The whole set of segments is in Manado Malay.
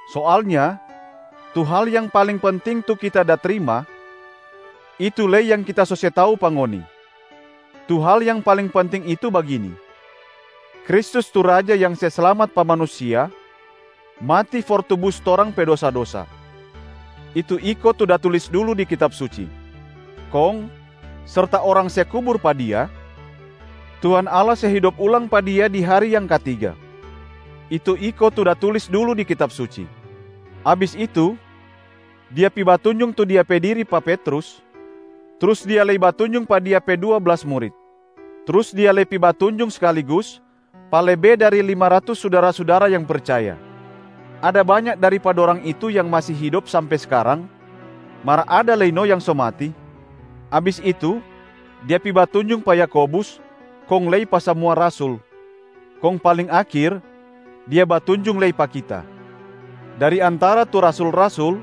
Soalnya tu hal yang paling penting tu kita da trima, itu lei yang kita so se tau pa ngoni. Tu hal yang paling penting itu bagini: Kristus tu Raja yang se slamat pa manusia mati for tubus torang pe dosa-dosa, itu iko tu da tulis dulu di Kitab Suci. Kong serta orang se kubur pa Dia, Tuhan Allah se hidop ulang pa Dia di hari yang katiga, itu iko tu da tulis dulu di Kitab Suci Abis itu, Dia pi batunjung tu Dia pe diri pa Petrus, trus Dia lei batunjung pa Dia pe dua blas murit. Trus Dia lei pi batunjung skaligus pa lebe dari lima ratus sudara-sudara yang percaya, ada banya dari pa dorang itu yang masi hidop sampe skarang mar ada lei no yang so mati. Abis itu, Dia pi batunjung pa Yakobus, kong lei pa samua rasul. Kong paling akhir, Dia batunjung lei pa kita. Dari antara tu rasul-rasul,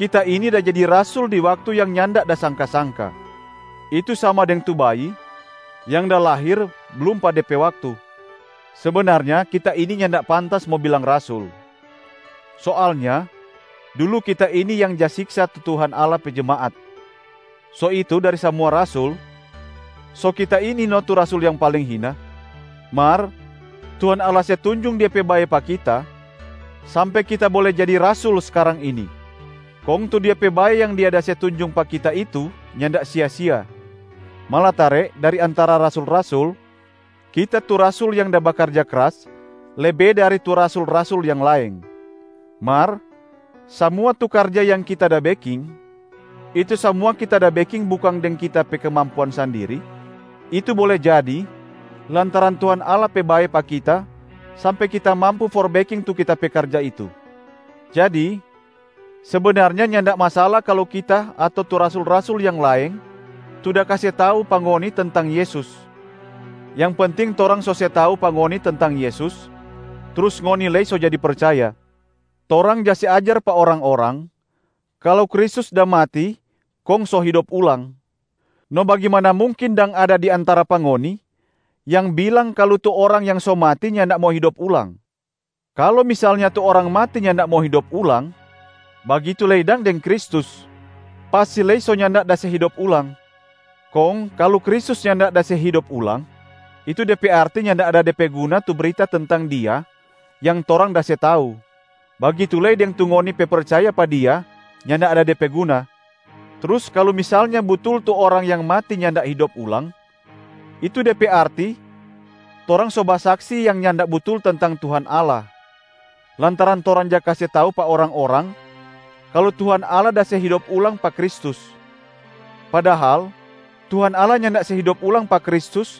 kita ini da jadi rasul di waktu yang nyanda da sangka-sangka, itu sama deng tu bayi yang da lahir blum pa de pe waktu. Sebenarnya kita ini nyanda pantas mo bilang rasul. Soalnya dulu kita ini yang ja siksa tu Tuhan Allah pe jemaat. So itu dari samua rasul, so kita ini no tu rasul yang paling hina. Mar Tuhan Allah se tunjung Dia pe bae pa kita sampe kita bole jadi rasul skarang ini, kong tu Dia pe bae yang Dia da se tunjung pa kita itu nyanda sia-sia. Malatare dari antara rasul-rasul, kita tu rasul yang da bakarja kras lebe dari tu rasul-rasul yang laeng. Mar samua tu karja yang kita da beking, itu samua kita da beking bukang deng kita pe kemampuan sandiri, itu bole jadi lantaran Tuhan Allah pe bae pa kita sampe kita mampu for beking tu kita pe karja itu. Jadi sebenarnya nyanda masala kalu kita ato tu rasul-rasul yang laeng tu da kase tau pa ngoni tentang Yesus, yang penting torang so se tau pa ngoni tentang Yesus, trus ngoni lei so jadi percaya. Torang ja se ajar pa orang-orang kalu Kristus da mati kong so hidop ulang. No bagimana mungkin dang ada dari antara pa ngoni yang bilang kalu tu orang yang so mati nyanda mo hidop ulang? Kalu misalnya tu orang mati nyanda mo hidop ulang, bagitu lei dang deng Kristus, pasti lei so nyanda da se hidop ulang. Kong kalu Kristus nyanda da se hidop ulang, itu de pe arti nyanda ada de pe guna tu brita tentang Dia yang torang da se tau, bagitu lei deng tu ngoni pe percaya pa Dia nyanda ada de pe guna. Trus kalu misalnya butul tu orang yang mati nyanda hidop ulang, itu de pe arti torang so basaksi yang nyanda butul tentang Tuhan Allah, lantaran torang ja kase tau pa orang-orang kalu Tuhan Allah da se hidop ulang pa Kristus. Padahal Tuhan Allah nyanda se hidop ulang pa Kristus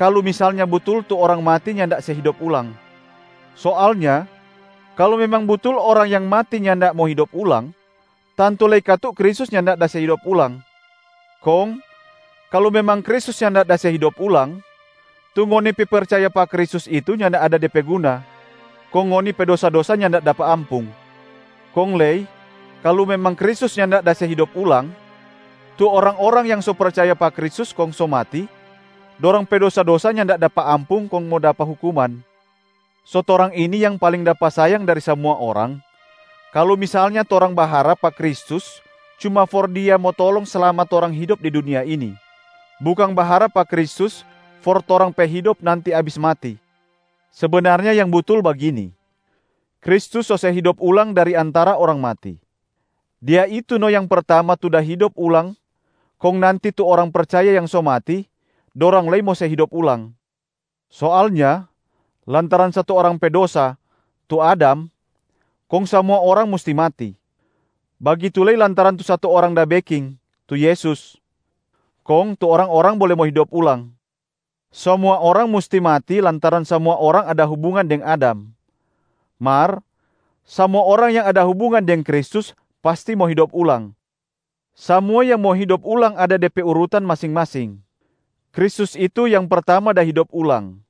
kalu misalnya butul tu orang mati nyanda se hidop ulang. Soalnya kalu memang butul orang yang mati nyanda mo hidop ulang, tantu lei katu Kristus nyanda da se hidop ulang. Kong kalu memang Kristus nyanda da se hidop ulang, tu ngoni pe percaya pa Kristus itu nyanda ada de pe guna, kong ngoni pe dosa-dosa nyanda dapa ampung. Kong lei kalu memang Kristus nyanda da se hidop ulang, tu orang-orang yang so percaya pa Kristus kong so mati, dorang pe dosa-dosa nyanda dapa ampung kong mo dapa hukuman. So torang ini yang paling dapa sayang dari samua orang kalu misalnya torang baharap pa Kristus cuma for Dia mo tolong slama torang hidop di dunia ini, bukang baharap pa Kristus for torang pe hidop nanti abis mati. Sebenarnya yang butul bagini: Kristus so se hidop ulang dari antara orang mati. Dia itu no yang pertama tu da hidop ulang kong nanti tu orang percaya yang so mati, dorang lei mo se hidop ulang. Soalnya lantaran satu orang pe dosa, tu Adam, kong samua orang musti mati. Bagitu lei lantaran tu satu Orang da beking, tu Yesus, kong tu orang-orang bole mo hidop ulang. Samua orang musti mati lantaran samua orang ada hubungan deng Adam, mar samua orang yang ada hubungan deng Kristus pasti mo hidop ulang. Samua yang mo hidop ulang ada de pe urutan masing-masing: Kristus itu yang pertama da hidop ulang,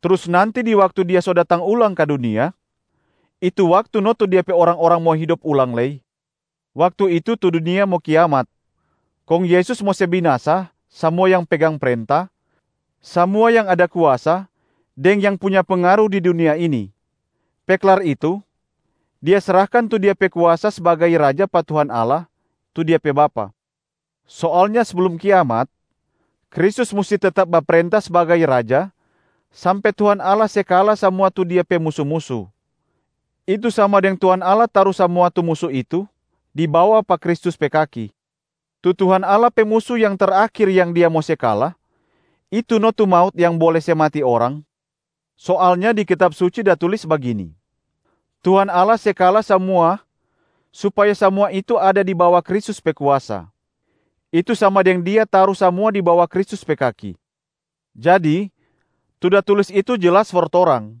trus nanti di waktu Dia so datang ulang ka dunia, itu waktu no tu Dia pe orang-orang mo hidop ulang lei. Waktu itu tu dunia mo kiamat, kong Yesus mo se binasa samua yang pegang prenta, samua yang ada kuasa deng yang punya pengaru di dunia ini. Pe klar itu, Dia srahkan tu Dia pe kuasa sbagai Raja pa Tuhan Allah, tu Dia pe Bapa. Soalnya seblum kiamat, Kristus musti tetap baprenta sbagai Raja sampe Tuhan Allah se kala samua tu Dia pe musu-musu, itu sama deng Tuhan Allah taru samua tu musu itu di bawa pa Kristus pe kaki. Tu Tuhan Allah pe musu yang terakhir yang Dia mo se kala, itu no tu maut yang bole se mati orang. Soalnya di Kitab Suci da tulis bagini, “Tuhan Allah se kala samua supaya samua itu ada di bawa Kristus pe kuasa, itu sama deng Dia taru samua di bawa Kristus pe kaki.” Jadi tu da tulis itu jelas for torang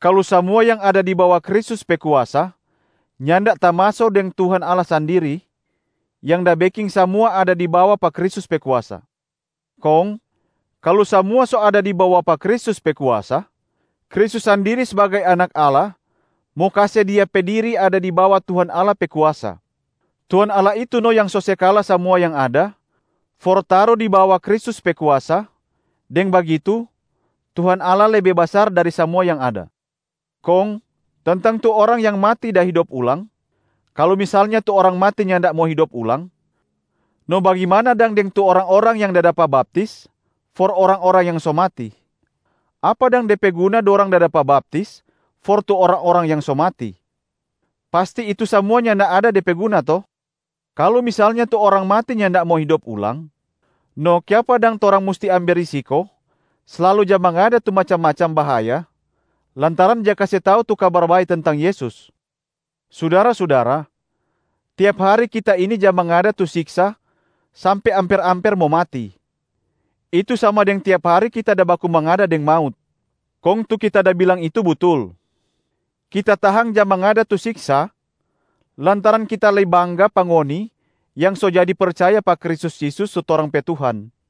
kalu samua yang ada di bawa Kristus pe kuasa, nyanda tamaso deng Tuhan Allah sandiri, yang da beking samua ada di bawa pa Kristus pe kuasa. Kong kalu samua so ada di bawa pa Kristus pe kuasa, Kristus sandiri sbagai Anak Allah mo kase Dia pe diri ada di bawa Tuhan Allah pe kuasa. Tuhan Allah itu no yang so se kala samua yang ada for taru di bawa Kristus pe kuasa, deng bagitu Tuhan Allah lebe basar dari samua yang ada. Kong tentang tu orang yang mati da hidop ulang, kalu misalnya tu orang mati nyanda mo hidop ulang, no bagimana dang deng tu orang-orang yang da dapa baptis for orang-orang yang so mati? Apa dang de pe guna dorang da dapa baptis for tu orang-orang yang so mati? Pasti itu samua nyanda ada de pe guna to? Kalu misalnya tu orang mati nyanda mo hidop ulang, no kiapa dang torang musti ambe risiko slalu ja mangada tu macam-macam bahaya lantaran ja kase tau tu Kabar Bae tentang Yesus? Sudara-sudara, tiap hari kita ini ja mangada tu siksa sampe amper-amper mo mati, itu sama deng tiap hari kita da baku mangada deng maut, kong tu kita da bilang itu butul. Kita tahang ja mangada tu siksa lantaran kita lei bangga pa ngoni yang so jadi percaya pa Kristus Yesus tu torang pe Tuhan.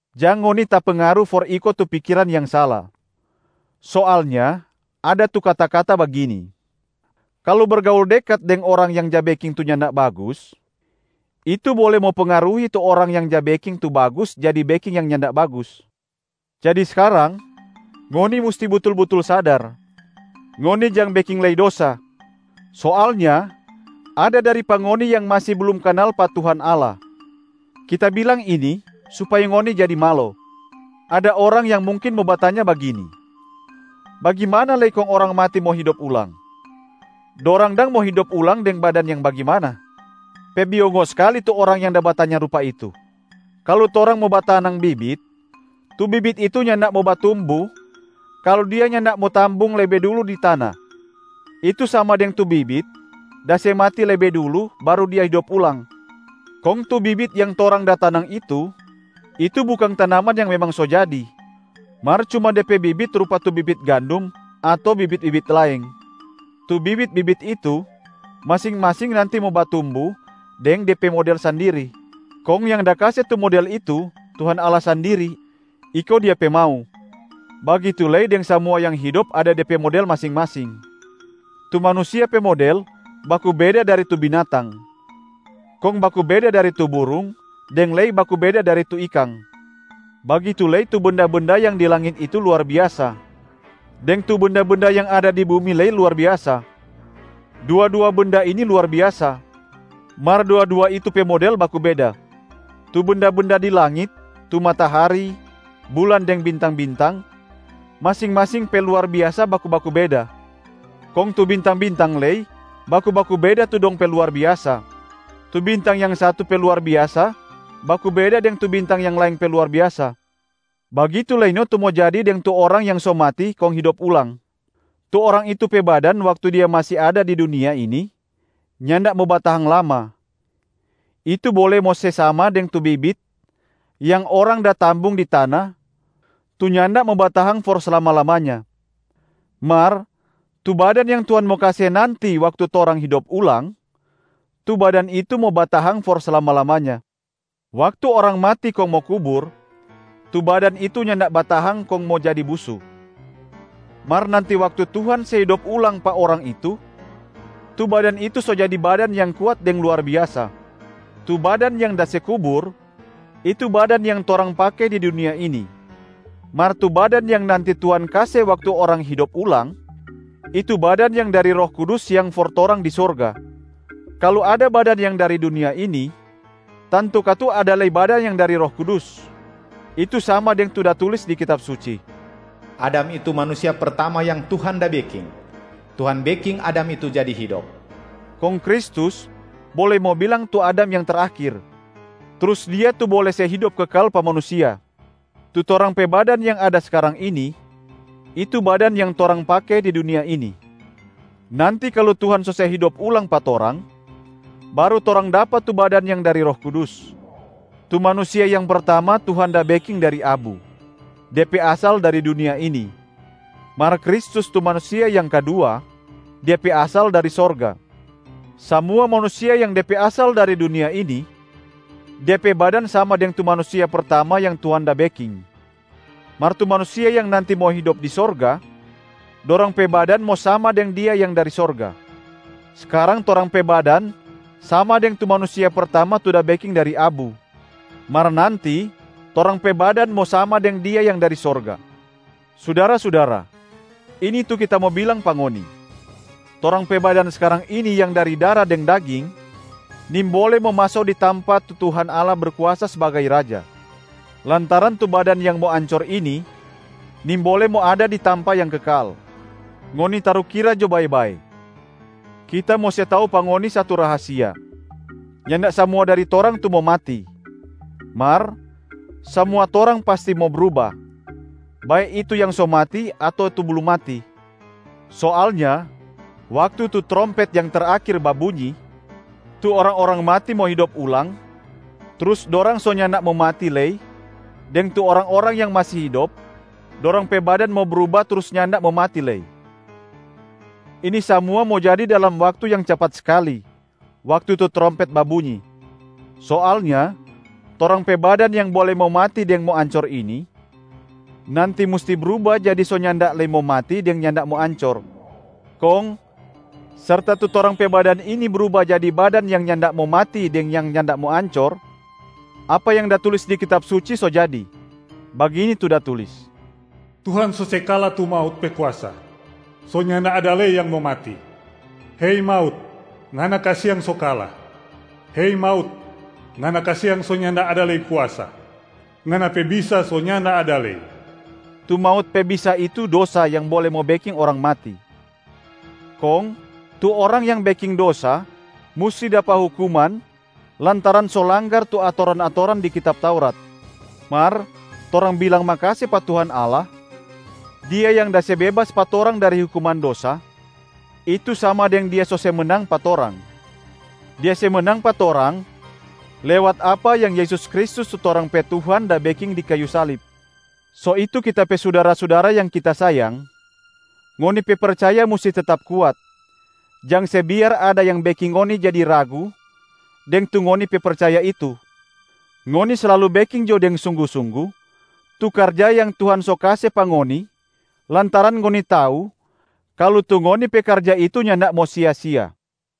Jang ngoni tapengaru for iko tu pikiran yang sala. Soalnya ada tu kata-kata bagini, “Kalu bergaul dekat deng orang yang ja beking tu nyanda bagus, itu bole mo pengaruhi tu orang yang ja beking tu bagus jadi beking yang nyanda bagus.” Jadi skarang ngoni musti butul-butul sadar, ngoni jang beking lei dosa. Soalnya ada dari pa ngoni yang masi blum kanal pa Tuhan Allah. Kita bilang ini supaya ngoni jadi malo. Ada orang yang mungkin mo batanya bagini, “Bagimana lei kong orang mati mo hidop ulang? Dorang dang mo hidop ulang deng badan yang bagimana?” Pe biongo skali tu orang yang da batanya rupa itu. Kalu torang mo batanang bibit, tu bibit itu nyanda mo batumbu kalu dia nyanda mo tambung lebe dulu di tana, itu sama deng tu bibit da se mati lebe dulu baru dia hidop ulang. Kong tu bibit yang torang da tanang itu, itu bukang tanaman yang memang so jadi, mar cuma de pe bibit rupa tu bibit gandum ato bibit-bibit laeng. Tu bibit-bibit itu masing-masing nanti mo batumbu deng de pe model sandiri, kong yang da kase tu model itu Tuhan Allah sandiri, iko Dia pe mau. Bagitu lei deng samua yang hidop ada de pe model masing-masing. Tu manusia pe model baku beda dari tu binatang, kong baku beda dari tu burung deng lei baku beda dari tu ikang. Bagitu lei, tu benda-benda yang di langit itu luar biasa, deng tu benda-benda yang ada di bumi lei luar biasa. Dua-dua benda ini luar biasa, mar dua-dua itu pe model baku beda. Tu benda-benda di langit, tu matahari, bulan deng bintang-bintang, masing-masing pe luar biasa baku-baku beda. Kong tu bintang-bintang lei baku-baku beda tu dong pe luar biasa, tu bintang yang satu pe luar biasa baku beda deng tu bintang yang laeng pe luar biasa. Bagitu lei no tu mo jadi deng tu orang yang so mati kong hidop ulang. Tu orang itu pe badan waktu dia masi ada di dunia ini nyanda mo batahang lama, itu bole mo se sama deng tu bibit yang orang da tambung di tana tu nyanda mo batahang for slama-lamanya. Mar tu badan yang Tuhan mo kase nanti waktu torang hidop ulang, tu badan itu mo batahang for slama-lamanya. Waktu orang mati kong mo kubur, tu badan itu nyanda batahang kong mo jadi busu. Mar nanti waktu Tuhan se hidop ulang pa orang itu, tu badan itu so jadi badan yang kuat deng luar biasa. Tu badan yang da se kubur, itu badan yang torang pake di dunia ini. Mar tu badan yang nanti Tuhan kase waktu orang hidop ulang, itu badan yang dari Roh Kudus yang for torang di sorga. Kalu ada badan yang dari dunia ini, tantu katu ada lei badan yang dari Roh Kudus. Itu sama deng tu da tulis di Kitab Suci, “Adam itu manusia pertama yang Tuhan da beking, Tuhan beking Adam itu jadi hidop.” Kong Kristus bole mo bilang tu Adam yang terakhir, trus Dia tu bole se hidop kekal pa manusia. Tu torang pe badan yang ada skarang ini, itu badan yang torang pake di dunia ini. Nanti kalu Tuhan so se hidop ulang pa torang, baru torang dapa tu badan yang dari Roh Kudus. Tu manusia yang pertama Tuhan da beking dari abu, de pe asal dari dunia ini. Mar Kristus tu manusia yang kadua, Dia pe asal dari sorga. Samua manusia yang de pe asal dari dunia ini, de pe badan sama deng tu manusia pertama yang Tuhan da beking. Mar tu manusia yang nanti mo hidop di sorga, dorang pe badan mo sama deng Dia yang dari sorga. Skarang torang pe badan sama deng tu manusia pertama tu da beking dari abu, mar nanti torang pe badan mo sama deng Dia yang dari sorga. Sudara-sudara, ini tu kita mo bilang pa ngoni: torang pe badan skarang ini yang dari dara deng daging nimbole mo maso di tampa tu Tuhan Allah Berkuasa sbagai Raja, lantaran tu badan yang mo ancor ini nimbole mo ada di tampa yang kekal. Ngoni tarukira jo bae-bae, kita mo se tau pa ngoni satu rahasia: nyanda samua dari torang tu mo mati, mar samua torang pasti mo bruba, bae itu yang so mati ato tu blum mati. Soalnya waktu tu trompet yang terakhir babunyi, tu orang-orang mati mo hidop ulang, trus dorang so nyanda mo mati lei deng tu orang-orang yang masi hidop, dorang pe badan mo bruba trus nyanda mo mati lei. Ini samua mo jadi dalam waktu yang capat skali, waktu tu trompet babunyi. Soalnya torang pe badan yang bole mo mati deng mo ancor ini, nanti musti bruba jadi so nyanda lei mo mati deng nyanda mo ancor. Kong serta tu torang pe badan ini bruba jadi badan yang nyanda mo mati deng yang nyanda mo ancor, apa yang da tulis di Kitab Suci so jadi. Bagini tu da tulis, “Tuhan so se kala tu maut pe kuasa, so nyanda ada lei yang mo mati. Hei maut, ngana kasiang so kala! Hei maut, ngana kasiang so nyanda ada lei kuasa, ngana pe bisa so nyanda ada lei.” Tu maut pe bisa itu dosa yang bole beking orang mati. Kong tu orang yang beking dosa musti dapa hukuman lantaran so langgar tu atoran-atoran di Kitab Taurat. Mar torang bilang makase pa Tuhan Allah, Dia yang da se bebas pa torang dari hukuman dosa, itu sama deng Dia so se menang pa torang. Dia se menang pa torang lewat apa yang Yesus Kristus tu torang pe Tuhan da beking di kayu salib. So itu kita pe sudara-sudara yang kita sayang, ngoni pe percaya musti tetap kuat, jang se biar ada yang beking ngoni jadi ragu deng tu ngoni pe percaya itu. Ngoni slalu beking jo deng sunggu-sunggu tu karja yang Tuhan so kase pa ngoni lantaran ngoni tau kalu tu ngoni pe karja itu nyanda mo sia-sia.